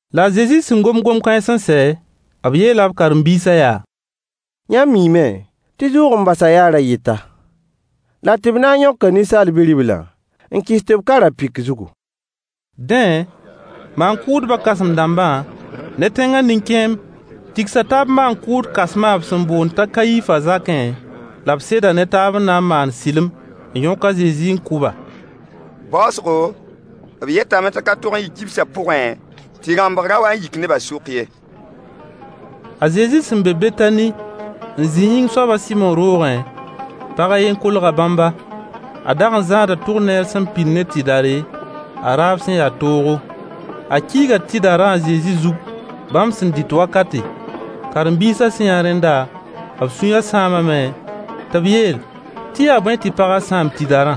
La a Zezi sẽn gom gom-kãens n sɛ, b yeela b karen-biisã yaa: Yãmb miime tɩ zʋʋg-n-basã yaa ra-yɩta, la tɩ b na n yõka Ninsaal Bi-riblã n kɩs tɩ b ka ra-pɩk zugu. Dẽ, maan-kʋʋdbã kãsem-dãmbã ne tẽngã nin-kẽemb tigsa taab maan-kʋʋd kãsmã b sẽn boond t'a Kayifã zakẽ, la b seda ne taab n na n maan sɩlem n yõk a Zezi n kʋ-ba. Baoosgo, b yetame tɩ ka tog n yɩ kibsã pʋgẽ, tɩ rãmbg ra wa n yik nebã sʋk ye. A Zezi sẽn be Betani n zĩ yĩng soab a Sɩmo roogẽ, pag a yen kolga bãmba. A dag n zãada albatr tʋk sẽn pid ne tɩdare, a raab sẽn ya toogo. A kiiga tɩdarã a Zezi zug bãmb sẽn dɩt wakate. Karen-biisã sẽn yã rẽnda, b sũyã sãamame tɩ b yeel tɩ yaa bõe tɩ pagã sãam tɩdarã?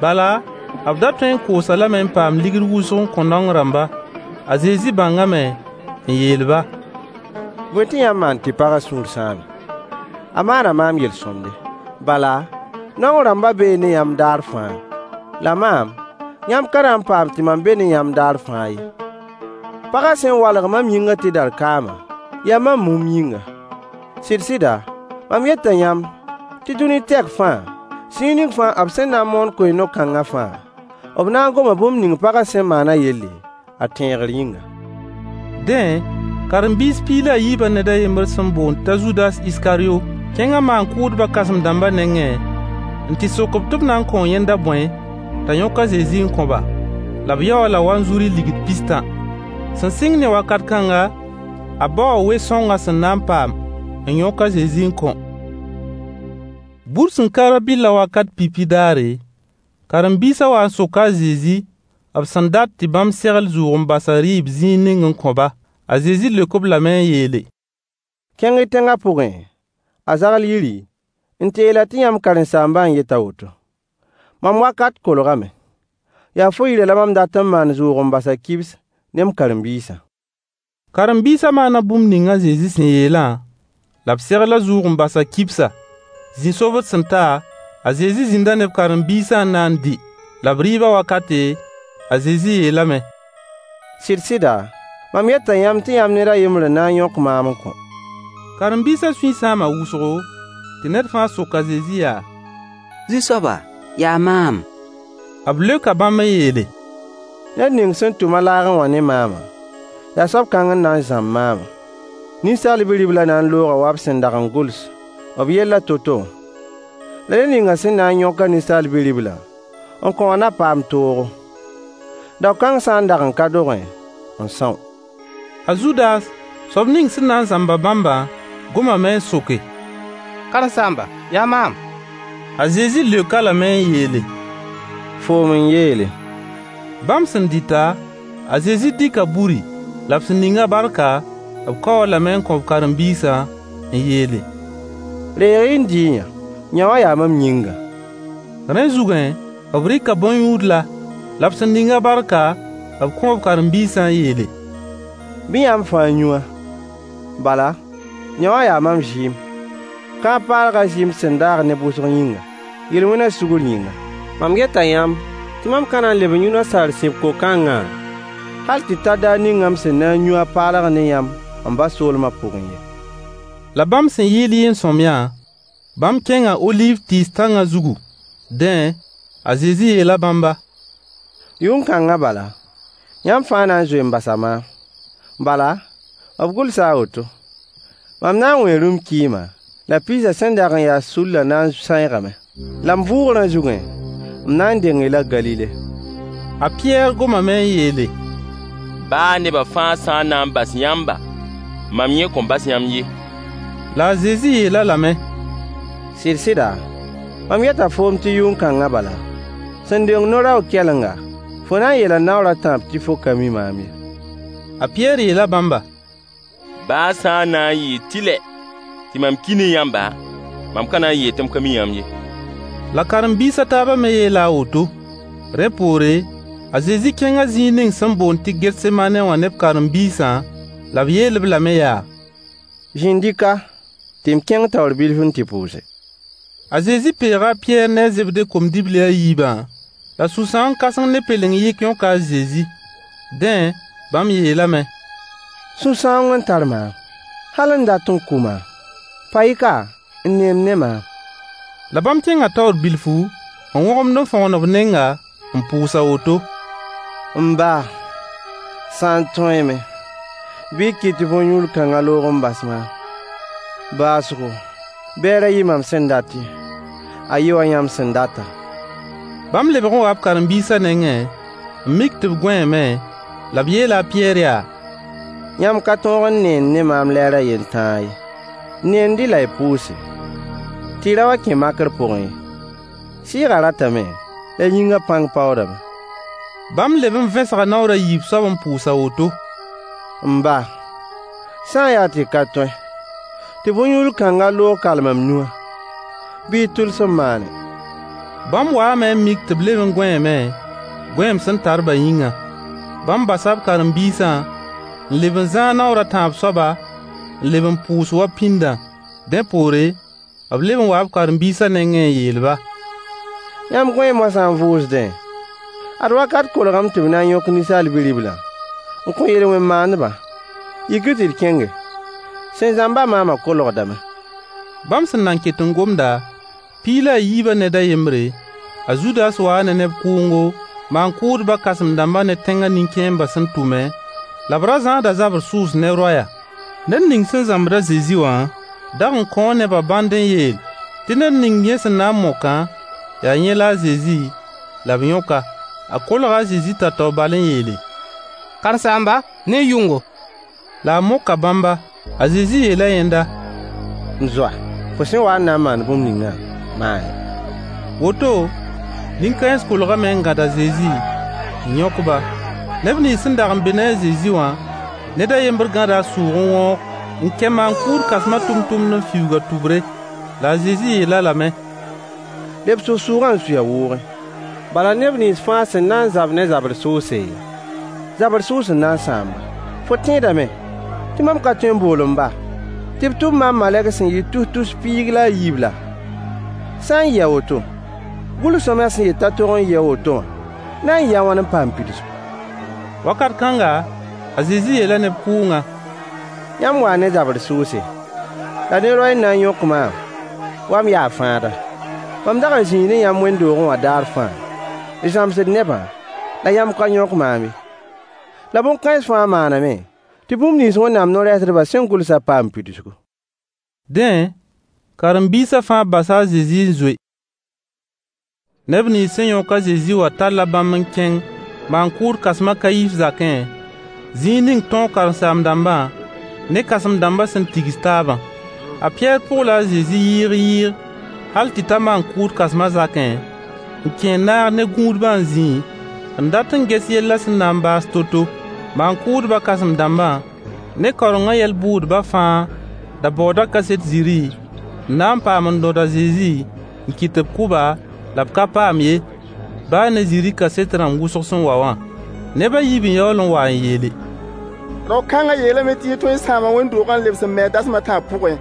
Bala, b da tõe n koos-a lame n paam ligd wʋsg n kõ naong rãmba. A Zezi bãngame n yeel-ba: Bõe tɩ yãmb maan tɩ pagã sũur sãame? A maana maam yel-sõmde. Bala, naong rãmbã bee ne yãmb daar fãa, la maam, yãmb ka na n paam tɩ mam be ne yãmb daar fãa ye. Pagã sẽn walg mam yĩngã tɩdar kaamã, yaa mam mumb yĩnga. Sɩd-sɩda, mam yeta yãmb tɩ dũni tɛk fãa, zĩig ning fãa b sẽn na n moon koe-no-kãngã fãa, b na n goma bũmb ning pagã sẽn maanã yelle, a tẽegr yĩnga. Dẽ, karen-biisã piig la a yiibã ned a yembr sẽn boond t'a Zudas Iskaryo kẽnga maan-kʋʋdbã kãsem-dãmbã nengẽ n tɩ sok-b tɩ b na n kõo yẽnda bõe t'a yõk a Zezi n kõ-ba? La b yao-a-la wanzuri ligd pis-tã. Sẽn sɩng ne wakat kãnga, a baoo we-sõng a sẽn na n paam n yõk a Zezi n kõ. Bur sẽn ka rã-bɩllã wakat pipi daare, karen-biisã waa n soka a Zezi b sẽn dat tɩ bãmb segl zʋʋg-n-basã rɩɩb zĩig ning n kõ-ba. A Zezi leok-b lame n yeele: Kẽng-y tẽngã pʋgẽ, a zagl yiri, n tɩ yeel-a tɩ yãmb karen-saambã n yet a woto: “Mam wakat kolgame. Yaa fo yirã la mam dat n maan zʋʋg-n-basã kibs ne m karen-biisã.” Karen-biisã maana bũmb ning a Zezi sẽn yeelã, la b segla zʋʋg-n-basã kibsa. Zĩ-sobd sẽn ta, a Zezi zĩnda ne b karen-biisã n na n dɩ. La b rɩɩbã wakate, a Zezi yeelame: Sɩd-sɩda, mam yeta yãmb tɩ yãmb ned a yembr n na n yõk maam n kõ. Karen-biisã sũy sãama wʋsgo, tɩ ned fãa sok a Zezi yaa: Zu-soaba, yaa maam? B leoka bãmb n yeele: Ned ning sẽn tʋm-a laagẽ wã ne maamã, yaa soab kãng n na n zãmb maamã. Ninsaal Bi-riblã na n looga wa b sẽn dag n gʋls b yellã to-to wã. La ned ning sẽn na n yõk-a Ninsaal Bi-riblã n kõ wã na paam toogo. Dao kãng sã n dag n ka dogẽ n são. A Zudas, soab ning sẽn na n zãmb-a bãmbã gomame n soke: Karen-saamba, yaa maam? A Zezi leok-a lame n yeele: Foom n yeele. Bãmb sẽn dɩta, a Zezi dɩka buri. La b sẽn ning-a barka, b kaoo-a lame n kõ b karen-biisã n yeele: Reeg n dɩ-y-yã. Yowã yaa mam yĩnga. Rẽ zugẽ, b rɩka bõn-yũudla. La b sẽn ning-a barka, b kõo b karen-biisã n yeele: Bɩ yãmb fãa yũ-a, bala, yõwã yaa mam zɩɩm, kãab-paalgã zɩɩm sẽn daag neb wʋsg yĩnga, yel-wẽna sugr yĩnga. Mam yeta yãmb tɩ mam ka na n leb n yũ nasaar sib ko-kãngã hal tɩ ta daar ning m sẽn na n yũ a paalg ne yãmb m ba soolmã pʋgẽ ye. La bãmb sẽn yɩɩl yɩɩn-sõamyã, bãmb kẽnga oliiv tɩɩs tãngã zugu. Dẽ, a Zezi yeela bãmba: Yʋn-kãngã bala, yãmb fãa na n zoee n basa maam. Bala, b gʋlsa a woto: “Mam na n wẽe rũm-kɩɩmã, la piisã sẽn dag n ya sullã na n sãeegame.” La m vʋʋgrã zugẽ, m na n deng-y la Galile. A Pɩyɛɛr gomame n yeele: Baa neba fãa sã n na n bas yãmba, mam yẽ kõn bas yãmb ye. La a Zezi yeel-a lame: Sɩd-sɩda, mam yeta foom tɩ yʋn-kãngã bala, sẽn deng no-raoog kɛlenga, fo na n yeela naoor a tãab tɩ fo ka mi maam ye. A Pɩyɛɛr yeela bãmba: Baa sã n na n yɩ tɩlae tɩ mam ki ne yãmba, mam ka na n yeel tɩ m ka mi yãmb ye. La karen-biis a taabã me yeela a woto. Rẽ poore, a Zezi kẽnga zĩig ning sẽn boond tɩ Getsemaane wã ne b karen-biisã, la b yeel-b lame yaa: Zĩnd-y ka tɩ m kẽng taoor bilf n tɩ pʋʋse. A Zezi peega a Pɩyɛɛr ne a Zebde kom-dibli a yiibã, la sũ-sãoong kãseng ne pelen-yɩk yõka a Zezi. Dẽ, bãmb yeelame: Sũ-sãoong n tar maam hal n dat n kʋ maam. Pa-y ka n neend ne maam. La bãmb kẽnga taoor bilfu, n wõgemd n fõgen b nenga, n pʋʋs a woto: M ba, sã n tõeeme, bɩ y kɩt tɩ bõn-yũudl kãngã loog n bas maam. Baoosgo, bɩ a ra yɩ mam sẽn dat ye, a yɩ wa yãmb sẽn data. Bãmb lebg n waa b karen-biisã nengẽ n mik tɩ b gõeeme, la b yeela a Pɩyɛɛr yaa: Yãmb ka tõog n neend ne maam lɛɛr a yen tãa ye. Neend-y la y pʋʋse, tɩ y ra wa n kẽ makr pʋgẽ ye. Sɩɩgã ratame, la yĩngã pãng paoodame. Bãmb leb n vẽsga naoor a yiib soab n pʋʋs a woto: M ba, sã n yaa tɩ ka tõe tɩ bõn-yũudl kãngã loog kal mam yũ-a, bɩ y tʋlsem maane. Bãmb waame n mik tɩ b leb n gõeeme, gõeem sẽn tar-bã yĩnga. Bãmb basa b karen-biisã n leb n zãag naoor a tãab soaba, n leb n pʋʋs wa pĩndã. Dẽ poore, b leb n waa b karen-biisã nengẽ n yeel-ba: Yãmb gõee moasã n vʋʋsdẽ. Ad wakat kolgame tɩ b na n yõk Ninsaal Bi-riblã n kõ yel-wẽn maandba. Yik-y tɩ d kẽnge. Sẽn zãmb-a maamã kolgdame. Bãmb sẽn na n ket n gomda, piig la a yiibã ned a yembre, a Zudas waa ne neb kʋʋngo, maan-kʋʋdba kãsem-dãmba ne tẽnga nin-kẽembã sẽn tʋme, la b ra zãada zabr sʋʋs ne roɛya. Ned ning sẽn zãmbd a Zezi wã dag n kõo nebã bãnd n yeel tɩ ned ning yẽ sẽn na n mokã, yaa yẽ la a Zezi, la b yõk-a. A kolga a Zezi tao-tao bal n yeele: Karen-saamba, ne y yʋngo! La a moka bãmba. A Zezi yeela yẽnda: M zoa, fo sẽn wa n na n maan bũmb ningã, maane. Woto, nin-kãens kolgame n gãd a Zezi, n yõk-ba. Neb nins sẽn dag n be ne a Zezi wã, ned a yembr gãda a sʋʋg n wõog n kɛ maan-kʋʋd kãsmã tʋmtʋmd n fiuug a tʋbre. La a Zezi yeel-a lame: Lebs f sʋʋgã n sui a wʋʋgẽ. Bala neb nins fãa sẽn na n zab ne zabr sʋʋse, zabr sʋʋs n na n sãam-ba. Fo tẽedame tɩ mam ka tõe n bool m ba tɩ b tʋm maam malegs sẽn yɩɩd tus-tus sul piig la a yiib laa? Sã n yɩ a woto, gʋls-sõamyã sẽn yet t'a tog n yɩɩ a woto wã na n yɩɩ a wãn n paam pidsgu. Wakat kãnga, a Zezi yeela neb kʋʋngã: Yãmb waa ne zabr sʋʋse la ne roɛy n na n yõk maam wa m yaa fãada. Mam dag n zĩi ne yãmb wẽnd-doogẽ wã daar fãa, n zãmsd nebã, la yãmb ka yõk maam ye. La bõn-kãens fãa maaname tɩ bũmb nins Wẽnnaam no-rɛɛsdbã sẽn gʋlsã paam pidsgu. Dẽ, karen-biisã fãa basa a Zezi n zoe. Neb nins sẽn yõk a Zezi wã talla bãmb n kẽng maan-kʋʋd kãsem a Kayif zakẽ, zĩig ning tõog karen-saam-dãmbã ne kãsem-dãmba sẽn tigs taabã. A Pɩyɛɛr pʋgla a Zezi yɩɩg-yɩɩg hal tɩ ta maan-kʋʋd kãsmã zakẽ, n kẽ n naag ne gũudbã n zĩẽ n dat n ges yellã sẽn na n baas to-to Maan-kʋʋdbã kãsem-dãmbã ne kaorengã yɛl bʋ-bʋʋdbã fãa da baooda kaset zĩrĩ n na n paam n rõd a Zezi n kɩt tɩ b kʋ-ba, la b ka paam ye, baa ne zĩrĩ kaset rãmb wʋsg sẽn wa wã. Neb a yiib n yaool n wa n yeele: Rao-kãngã yeelame tɩ yẽ tõe n sãama wẽnd-doogã n lebs n me-a dasem a tãab pʋgẽ.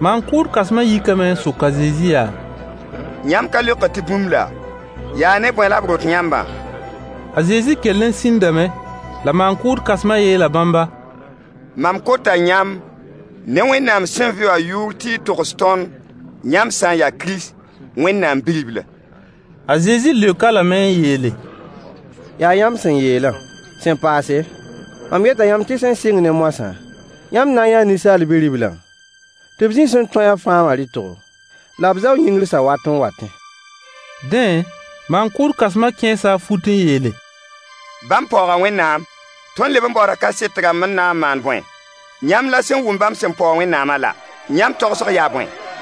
Maan-kʋʋd kãsmã yikame n sok a Zezi yaa: Yãmb ka leokd tɩ bũmb laa? Yaa ne bõe la b rõt yãmbã? A Zezi kell n sĩndame. La maan-kʋʋd kãsmã yeela bãmba: Mam kota yãmb ne Wẽnnaam sẽn vɩ wã yʋʋr tɩ y togs tõnd yãmb sã n yaa Kirist, Wẽnnaam Bi-ribla. A Zezi leok-a lame n yeele: Yaa yãmb sẽn yeelã. Sẽn paase, mam yeta yãmb tɩ sẽn sɩng ne moasã, yãmb na n yãa “Ninsaal Bi-riblã, tɩ b zĩ Sẽn-Tõe-a-fãa wã rɩtgo, la b zao yĩngr sawat n watẽ.” Dẽ, maan-kʋʋd kãsmã kẽesa a fut n yeele: Bãmb paooga Wẽnnaam. Tõnd leb n baooda kaset dãmb n na n maan bõe? Yãmb la sẽn wʋm bãmb sẽn paoog Wẽnnaamã la! Yãmb tagsg yaa bõe?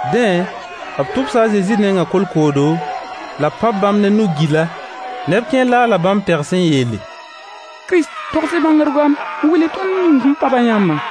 Dẽ, b tʋbsa a Zezi nengã kolkoodo, la b pãb bãmb ne nug-gila. Neb kẽer laala bãmb pegs n yeele: Kirist, togs-y bãngr gomd n wilg tõnd ned ning sẽn pãb-a yãmbã.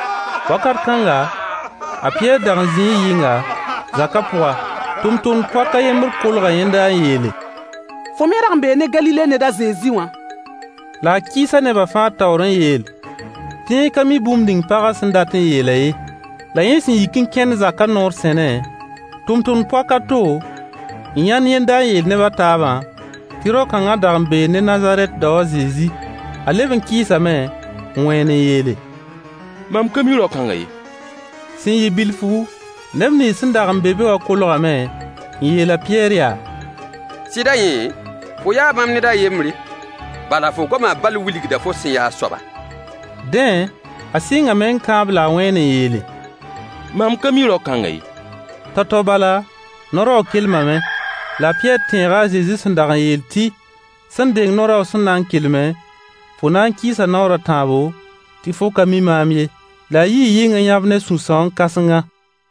Wakat kãnga, a Pɩyɛɛr dag n zĩi yɩnga, zaka pʋga. Tʋmtʋmd-poak a yembr kolga yẽnda n yeele: Fo me rag n bee ne Galile ned a Zezi wã. La a kɩɩsa neba fãa taoor n yeel tɩ yẽ ka mi bũmb ning pagã sẽn dat n yeelã ye. La yẽ sẽn yik n kẽnd zakã noor sẽne, tʋmtʋmd-poak a to n yãnd yẽnda n yeel neb a taabã tɩ rao-kãngã dag n bee ne Nazarɛt dao a Zezi. A leb n kɩɩsame, n wẽen n yeele: Mam ka mi rao-kãngã ye. Sẽn yɩ bilfu, neb nins sẽn dag n be be wã kolgame n yeel a Pɩyɛɛr yaa: Sɩda yẽ, fo yaa bãmb ned a yembre, bala fo goamã bal wilgda fo sẽn ya a soaba. Dẽ, a sɩngame n kãab la a wẽen n yeele: Mam ka mi rao-kãngã ye. Tao-tao bala, no-raoog kelmame. La a Pɩyɛɛr tẽega a Zezi sẽn dag n yeel tɩ: Sẽn deng no-raoog sẽn na n kelme, fo na n kɩɩsa naoor a tãabo, tɩ fo ka mi maam ye. La a yii yɩng n yãb ne sũ-sãoong-kãsenga.